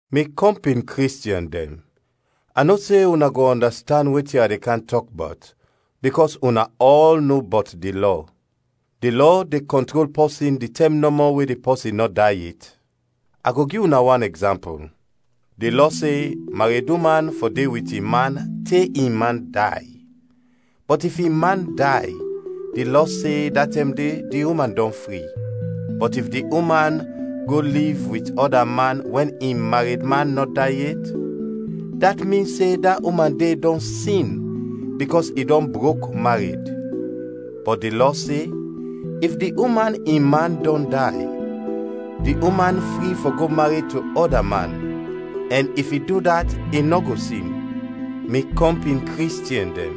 Mi kɔmpin Kristiɛn dɛn, a no se una go ɔndastand wetin a de kam tɔk bɔt, bikɔs una ɔl no bɔt di lɔ. Di lɔ de kɔntrol pɔsin di tɛm nɔmɔ we di pɔsin nɔ day yet. A go gi una wan ɛgzampul: Di lɔ se mareduman fɔ de wit in man te in man day; bɔt if in man day, di lɔ se da tɛm de di uman dɔn fri. Bɔt if di uman go liv wit ɔda man wɛn in maredman nɔ day yet, dat min se da uman de dɔn sin bikɔs i dɔn brok mared; bɔt di lɔ se if di uman in man dɔn day, di uman fri fɔ go mared to ɔda man, ɛn if i du dat i nɔ go sin. Mi kɔmpin Kristiɛn dɛn,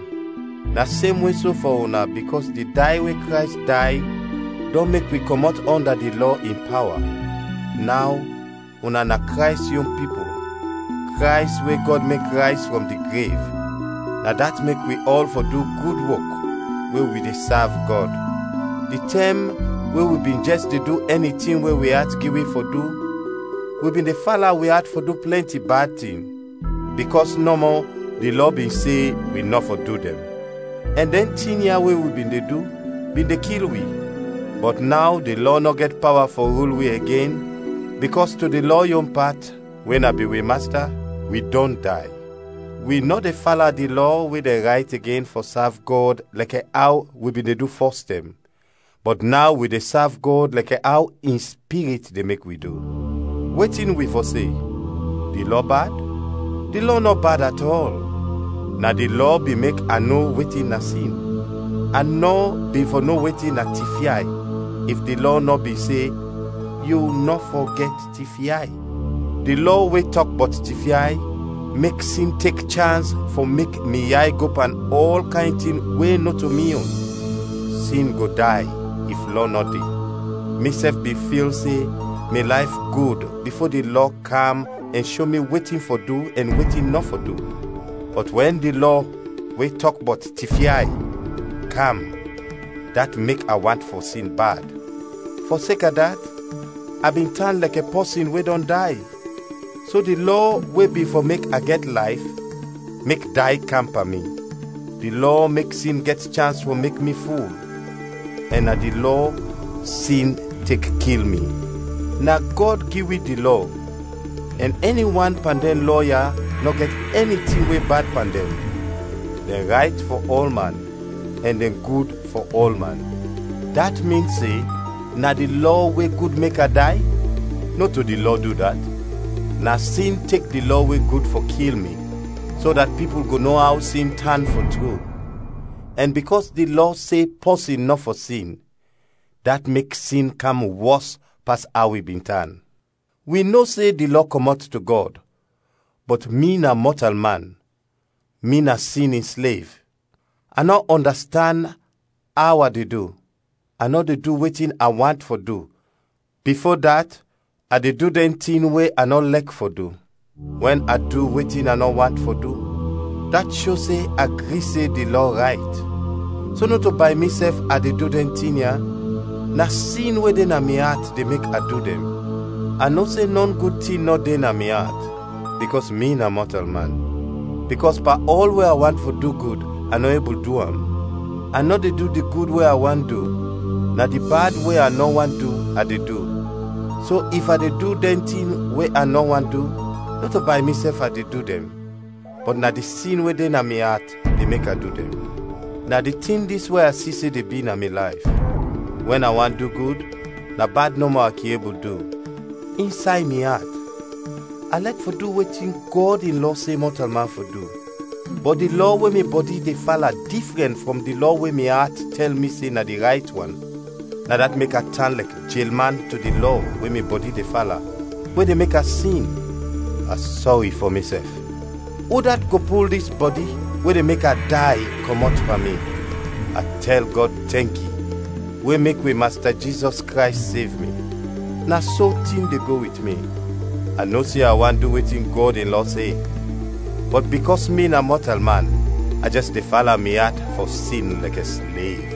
na semwe so fɔ una bikɔs di day we Krays day dɔn mek wi kɔmɔt ɔnda di Lɔ in pawa. Naw una na Krays yon pipul, Krays we Gɔd mek rayz frɔm di grev, na dat mek wi ɔl fɔ du gud wok we wi de sav Gɔd. Di tɛm we wi bin jɛs de du ɛni tin we wi at gi wi fɔ du, wi bin de fala wi at fɔ du plɛnti bad tin, bikɔs nɔmɔ di lɔ bin se wi nɔ fɔ du dɛn; ɛn dɛn tin ya we wi bin de du bin de kil wi. Bɔt naw di Lɔ nɔ gɛt pawa fɔ rul wi igen bikɔs to di Lɔ yon pat, we na bin wi masta, wi dɔn day. Wi nɔ de fala di Lɔ we dɛn rayt igen fɔ sav Gɔd lɛkɛ aw wi bin de du fɔstɛm, bɔt naw wi de sav Gɔd lɛkɛ aw in Spirit de mek wi du. Wetin wi fɔ se? Di Lɔ bad? Di Lɔ nɔ bad atɔl! Na di Lɔ bin mek a no wetin na sin. A nɔ bin fɔ no wetin na tifyay if di Lɔ nɔ bin se, “Yu nɔ fɔ gɛt tifyay.” Di lɔ we tɔk bɔt tifyay mek sin tek chans fɔ mek mi yay go pan ɔl kayn tin we nɔto mi yon. Sin go day if Lɔ nɔ de. Misɛf bin fil se mi layf gud bifo di Lɔ kam ɛn sho mi wetin fɔ du ɛn wetin nɔ fɔ du, bɔt wɛn di lɔ we tɔk bɔt tifyay, kam, dat mek a want fɔ sin bad. Fɔseka dat, a bin tan lɛkɛ pɔsin we dɔn day. So di lɔ we bin fɔ mek a gɛt layf, mek day kam pan mi. Di lɔ mek sin gɛt chans fɔ mek mi ful, ɛn na di lɔ sin tek kil mi. Na Gɔd gi wi di Lɔ, ɛn ɛni wan pan dɛn lɔ ya nɔ gɛt ɛni tin we bad pan dɛn, dɛn rayt fɔ ɔlman, ɛn dɛn gud fɔ ɔlman. Dat min se na di Lɔ we gud mek a day? Nɔto di Lɔ du dat! Na sin tek di Lɔ we gud fɔ kil mi so dat pipul go no aw sin tan fɔ tru, ɛn bikɔs di lɔ se pɔsin nɔ fɔ sin, dat mek sin kam wɔs pas aw i bin tan. Wi no se di lɔ kɔmɔt to Gɔd, bɔt mi na mɔtalman, mi na sin in slev. A nɔ ɔndastand aw a de du: a nɔ de du wetin a want fɔ du, bifo dat, a de du dɛn tin we a nɔ lɛk fɔ du. Wɛn a du wetin a nɔ want fɔ du, dat sho se a gri se di Lɔ rayt. So nɔto bay misɛf a de du dɛn tin ya, na sin we de na mi at de mek a du dɛn. A no se nɔ gud tin nɔ de na mi at, bikɔs mi na mɔtalman. Bikɔs pan ɔl we a want fɔ du gud, a nɔ ebul du am. A nɔ de du di gud we a want du, na di bad we a nɔ want du, a de du. So if a de du dɛn tin we a nɔ want du, nɔto bay misɛf a de du dɛn, bɔt na di sin we de na mi at de mek a du am. Na di tin dis we a si se de bi na mi layf: Wɛn a want du gud, na bad nɔmɔ a kin ebul du. Insay mi at, a lɛk fɔ du wetin Gɔd in lɔ se mɔtalman fɔ du. Bɔt di lɔ we mi bɔdi de fala difrɛn frɔm di lɔ we mi at tɛl mi se na di rayt wan. Na dat mek a tan lɛkɛ jelman to di lɔ we mi bɔdi de fala, we de mek a sin. A sɔri fɔ misɛf! Udat go pul dis bɔdi, we de mek a day, kɔmɔt pan mi? A tɛl Gɔd tɛnki we mek wi Masta Jizɔs Krays sev mi. Na so tin de go wit mi: A no se a want du wetin Gɔd in lɔ se, bɔt bikɔs mi na mɔtalman a jɛs de fala mi at fɔ sin lɛkɛ slev.